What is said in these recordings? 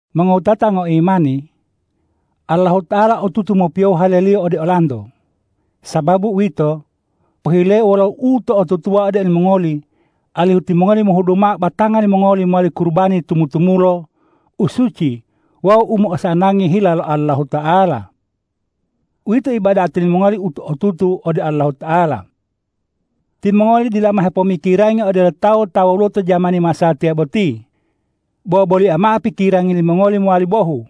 Mongowutata ngoimani, Allahuta'ala otutu mopiyohu hale-Liyo ode olanto. Sababu uwito, pohileu wolo uto'otutuwa ode olimongoli alihu timongoli mohudu mao batanga limongoli mowali kurubani tumu-tumulo, u suci wawu u mo'osanangi hila lo Allahuta'ala. Uwito ibadati limongoli u otutu ode Allahuta'ala. Timongoli dila mao hepomikirangi odelo tawu ta woluwo to jamani masatiya boti, bo bolia mao pikirangi limongoli mowali bohu,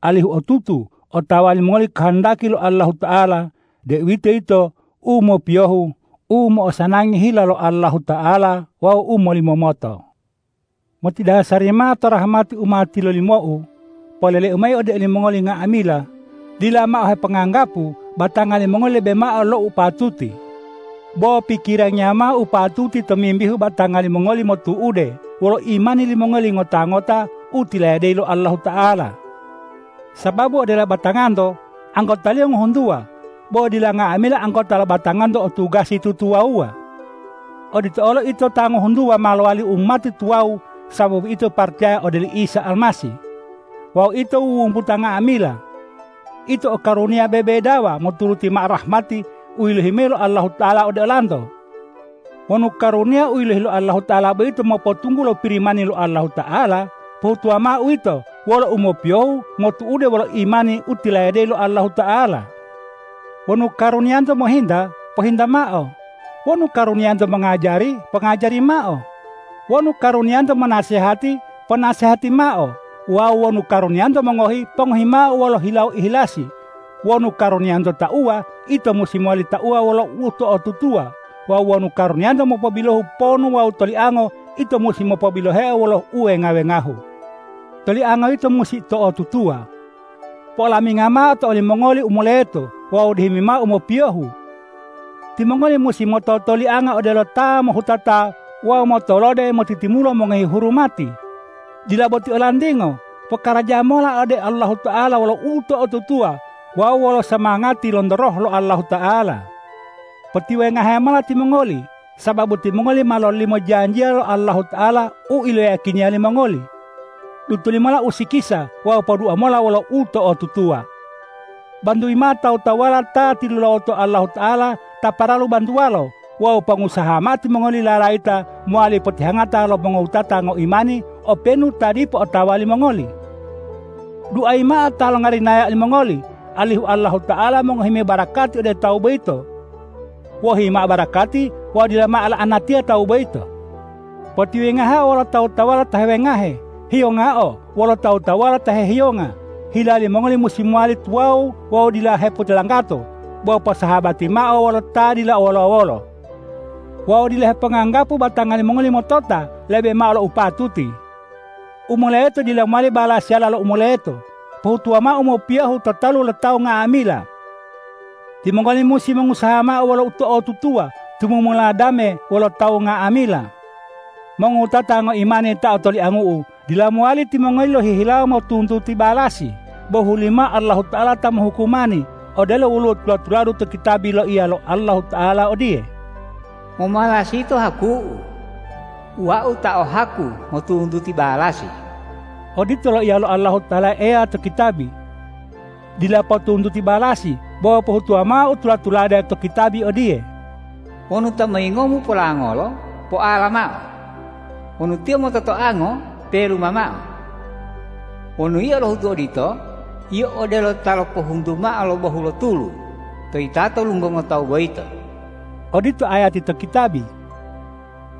alihu otutu otawa limongoli kohondaki lo Allahuta'ala, deuwitoyito u mopiyohu, u mo'osanangi hila lo Allahuta'ala wawu u molimomoto. Motidasari mao to rahmati u ma tilolimou, poleleu mayi ode olimongoli nga'amila: Dila mao heponganggapu batanga limongoli lebe mao lo u patuti, bo pikirangiya mao u patuti tomimbihu batanga limongoli motu'ude wolo imani limongoli ngota-ngota u tilayadeyi lo Allahuta'ala. Sababu odelo batanganto anggotaliyo ngohuntuwa, bo dila nga'amila anggota lo batanganto o tugasi tutuwawuwa. Odito olo ito ta ngohuntuwa ma lowali umati tuwawu sababu ito paracaya ode oli Isa Almasih. Wawu ito wuwumbuta nga'amila. Ito o karuniya bebedawa moturuti mao rahmati u yilohi mayi lo Allahuta'ala ode olanto. Wonu karuniya u yilohi lo Allahuta'ala boyito mopotunggulo Pirimani lo Allahuta'ala, pohutuwa mao uwito wolo umopiyohu motu'ude wolo imani u tilayadeyi lo Allahuta'ala. Wonu karuniyanto mohinta, pohinta mao; wonu karuniyanto mongajari, pongajari mao; wonu karuniyanto monasehati, ponasehati mao. Wawu wonu karuniyanto mongohi, pongohi mao wolo hilawo ihilasi; wonu karuniyanto tauwa, ito musi mowali tauwa wolo uto'otutuwa; wawu wonu karuniyanto mopobilohu ponu wawu toliango, ito musi mopobiloheo wolo uwenga-wengahu. Tolianga yito musi to'otutuwa. Po'olaminga mao to olimongoli u moleto wawu dihimi mao u mopiyohu. Timongoli musi mototolianga odelo ta mohutato wawu motolode motitimulo mongohi hurumati. Dila boti olantingo. Pokaraja mola ode Allahuta'ala wolo uto'otutuwa wawu wolo somangati lonto Roh lo Allahuta'ala. Potiwengahe mola timongoli, sababu timongoli ma mololimo janjiya lo Allahuta'ala u iloyiyakiniya limongoli. Dutoli mola usikisa wawu podua mola wolo uto'otutuwa. Bantuyi mao tawu-tawuwala ta tilulawoto Allahuta'ala ta paralu bantuwalo wawu pongusaha mao timongoli lalayita mowali potihangata lo mongowutata ngoimani openu ta dipo otawa limongoli. Duayi mao ta longarinaya olimongoli, alihu Allahuta'ala mongohi mayi barakati ode tawu boyito. Wohi mao barakati wawu dila mao la'anatiya tawu boyito. Potiwengaheo wolo tawu-tawuwala ta hewengahe; hiyongao wolo tawu-tawuwala ta hehiyonga. Hila limongoli musi mowali tuwawu wawu dila hepotilanggato, bo posahabatiya mao wolo ta dila o wolo-wolo. Wawu dila heponganggapu batanga limongoli motota lebe mao lo u patuti. U moleto dila mowali balasiyala lo u moleto. Pohutuwa mao u mopiyohu to talu lo tawu nga'amila. Timongoli musi mongusaha mao wolo uto'otutuwa tumumula dame wolo tawu nga'amila. Mongowutata ngoimani ta otoliangu'u, dila mowali timongoli lohihilawo motuntuti balasi, bo hulimao Allahuta'ala ta mohukumani. Odelo woluwo tula-tuladu to kitabi loiya lo Allahuta'ala odiye,”Momalasi yito haku-U. Wau ta o haku motuntuti balasi.” Odito loiya lo Allahuta'ala Eya to kitabi. Dila potuntuti balasi, bo pohutuwa mao u tula-tulade to kitabi odiye,”Wonu ta moyingomu polangolo, poala mao; wonu tiyo mototoango, peluma mao. Wonu yio lohutu odito, yio odelo ta lopohuntu mao lo bohu lo tulu to yitato lunggongo tawu boyito.” Odito ayati to kitabi.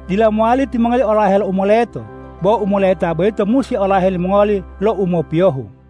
Dila mowali timongoli olahe lo u moleto, bo u moleta boyito musi olahe limongoli lo u mopiyohu!